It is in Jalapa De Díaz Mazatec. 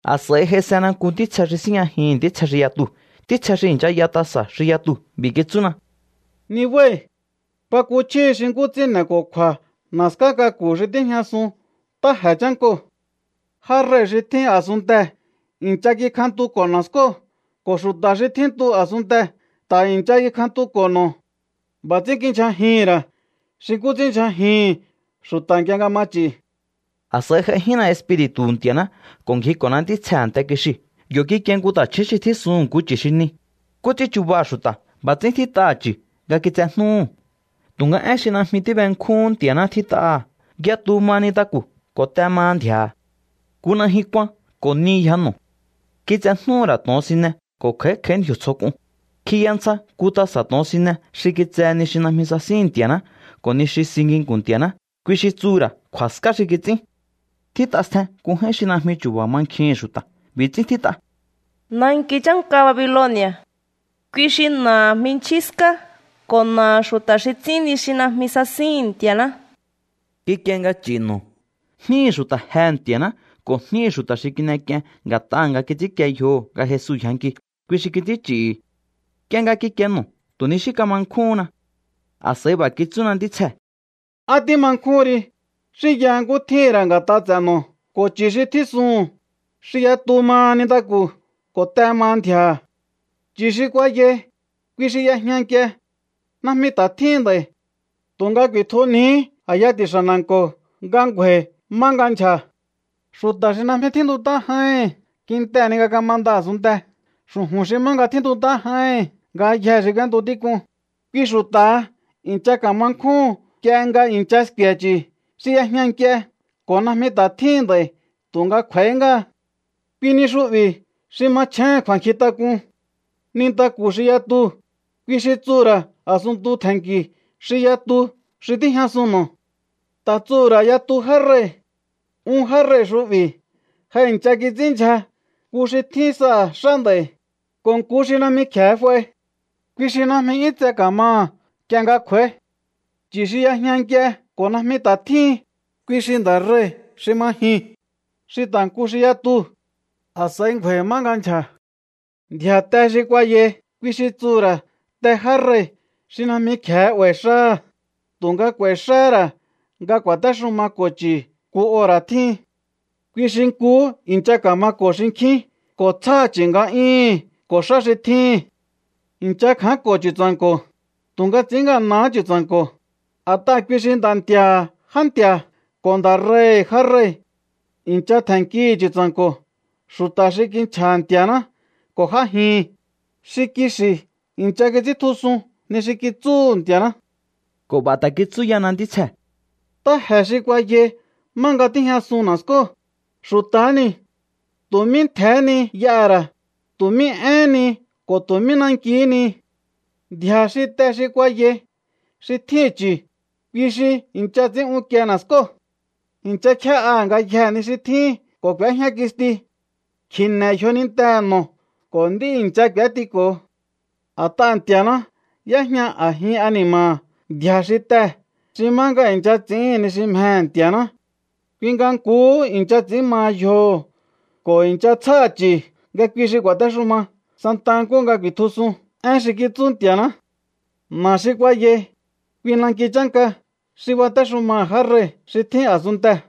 A̱s'a̱i j'aisena nku ntítsje xi síjñajihi̱n ntítsje xi yatuu̱, ntítsje xi i̱ncha y'a tasa̱ xi yatuu̱. B'i̱ kitsúna: —Nibái̱. Kuakuchjíhi xi nkú ts'ín n'e̱ko̱kju̱a̱ na̱ská k'aku̱ xi tíjñasun ntáje̱ chánkoo̱. Já rei̱ xi tjín a̱sunntee̱ i̱ncha kikjantuko̱ na̱skóo̱ ko̱ xu̱ta̱ xi tjíntu a̱sunntee̱ ta̱ i̱ncha kikjantuko̱ no̱. B'a̱ ts'ín kindyjajihi̱n ra̱ xi nkú ts'ínndyjajihi̱n xu̱ta̱ nk'ie nga ma ch'i̱. A̱s'a̱i j'aijínna Espiri̱tu̱hu̱ Nti̱a̱ná ko̱ ngjiko̱na ntítsjee̱ a̱nte kixiu̱. Yo̱ kikie nku ta̱chju̱ún xi tjísuhu̱n nku chu̱ xi ni. Nkú ts'ín chubaha̱ xu̱ta̱, b'a̱ ts'ín tjít'aha̱ chu̱ nga kitsejnúhu̱. Tu̱nga én xi najmi tíbenkjúhún Nti̱a̱ná tjít'aha̱. Yatu maha nintaku̱ ko̱ te maha ndji̱a̱ha̱. Nku najyun kuan ko̱ ni yja no̱. Kitsejnúhu̱ ra̱ to̱onsine ko̱ kj'a̱í kj'a̱í ndji̱o̱ tsjo k'un. Kjiya ntsja nku tasa̱ to̱onsine xi kitsehe ni xi najmi sasíhi̱n Nti̱a̱ná ko̱ ni xi si nginku̱n Nti̱a̱ná, kui xi tsuhu̱ ra̱ kju̱a̱ská xi kits'ín. Tjít'a stjen nku j'áín xi najmi chu̱ba̱ mankjihi̱n xu̱ta̱. B'i̱ ts'ín tjít'a: “Nanki chánka Babiloni̱a̱.” Kui xi na̱aha̱ jminchjín ská ko̱ na̱aha̱ xu̱ta̱ xi ts'ín ni xi najmi sasíhi̱n Nti̱a̱ná. Kikie nga ch'i̱ no̱. Jníhi̱ xu̱ta̱ jehe̱ Nti̱a̱ná ko̱ jníhi̱ xu̱ta̱ xi kin'ek'ien nga̱t'aha̱ nga kits'ínkie yjoho̱ nga Jesu yjanki, kui xi kits'ín ch'i̱hi̱. Nk'ie nga kikie no̱, tu̱ ni xí kama nkjúhúnna. A̱s'a̱i b'a̱ kitsúna ntítsjee̱: —¿Á tíma nkjúhun ri? Xínyaha nkú tjíhi̱n ra̱ nga̱t'a ts'e̱ no̱ ko̱ chu̱ xi tjísuhu̱n, xi yatu maha nintaku̱ ko̱ te maha ndji̱a̱ha̱. Chu̱ xi kuayai, kui xi y'ejña nk'ie. Najmi ta̱ tjíhin nd'a̱i̱. Tu̱nga ku̱i̱tjunjihí a̱ya ti̱xa̱ na̱nko̱ nga ngju̱a̱i̱ má nga ndyja̱. Xu̱ta̱ xi najmi tjíntut'á j'áíhi̱n kintehe̱ ni nga kamanda a̱sunntee̱ xu̱ju̱n xi má nga tjíntut'á j'áíhi̱n ngayjee̱ xi k'úéntu tík'un, kui xu̱ta̱ha i̱ncha ka̱ma nkjúhu̱n nk'ie nga i̱ncha sku̱e̱ chu̱ xi y'ejña nk'ie ko̱ najmi ta̱ tjíhin nd'a̱i̱ tu̱nga kj'u̱a̱í ngáha. ’Kui ni xu'bi̱ xi machjéhe̱n kju̱a̱nkjintak'un. Nintaku̱ xi yatuu̱, kui xi tsuhu̱ ra̱ a̱sunntu tje̱nki̱ xi yatu xi tíjñasun no̱. Ta̱ tsuhu̱ ra̱ yatu já rei̱. Un já rei̱ xu'bi̱ ja i̱ncha kits'ínndyja, nku xi tjín saha̱ xá nd'a̱i̱, ko̱ nku xi najmi kje̱e f'ai. Kui xi najmi 'yún tse ka̱maha̱ nk'ie nga kj'u̱a̱í. Chu̱ xi y'ejña nk'ie ko̱ najmi ta̱ tjíhin, kui xi nda̱ rei̱ xi ma jiu̱n, xi ta̱ nku xi yatuu̱. A̱s'a̱i ngju̱a̱i̱ má nga ndyja̱. ’Ndji̱a̱ te xi kuayai, kui xi tsuhu̱ ra̱ te já rei̱ xi najmi kje̱e 'ba̱i̱ xáha̱, tu̱nga k'u̱a̱i̱ xáhá ra̱ nga ku̱a̱téxumako̱ chu̱ nku ora̱ tjíhin. Kui xi nkuhú i̱ncha ka̱mako̱ xinkjín ko̱ tsjáha̱ chu̱ nga'yúhu̱n ko̱ xá xi tjíhi̱n. I̱ncha kja̱ánko̱ Chu̱tsa̱nko̱, tu̱nga ts'i̱ín ngana̱há Chu̱tsa̱nko̱, a̱t'aha̱ kui xi Nda̱ Nti̱a̱ha̱ já nti̱a̱ ko̱ Nda̱ rei̱hi̱ já rei̱. I̱ncha tje̱nnkihi̱ Chu̱tsa̱nko̱ xu̱ta̱ xi kinchja̱ha̱ Nti̱a̱ná ko̱ j'ájihi̱n, xi kixi̱ i̱ncha kits'íntjusun ni xi kitsúhu̱ Nti̱a̱ná. Ko̱ b'a̱ ta̱ kitsú yana ntítsjee̱: —Ntáje̱ xi kuayai má nga tíjñasun na̱skóo̱, xu̱ta̱há niu̱. Tu̱ mí ntje̱hé ni y'aha̱ra̱, tu̱ mí éhén ni ko̱ tu̱ mí nankihí ni. Ndji̱a̱ xi te xi kuayai xi tjíhi̱n chu̱, kui xi i̱ncha ts'i̱ín unkie na̱skóo̱. I̱ncha kjé'aha̱ ngayjee̱ ni xi tjíhi̱n ko̱ k'u̱éjña kisti. Kji̱ne̱ yjonintehe̱ no̱ ko̱ nd'í i̱ncha k'u̱étiko̱ho. A̱t'aha̱ Nti̱a̱ná y'éjña a̱jin ani̱ma̱ha̱ ndji̱a̱ xi tee̱ xi má nga i̱ncha ts'i̱ín ni xi mjehe̱ Nti̱a̱ná. Kui nga nkuhú i̱ncha ts'i̱ín maha yjoho̱ ko̱ i̱ncha tsjáha̱ chu̱ nga kui xi ku̱a̱téxuma santa nkúhu nga ku̱i̱tjusun én xi kitsú Nti̱a̱ná. Na̱ xi kuayai, kui nanki chánka xi batéxumaha̱ já rei̱ xi tjín a̱sunntee̱.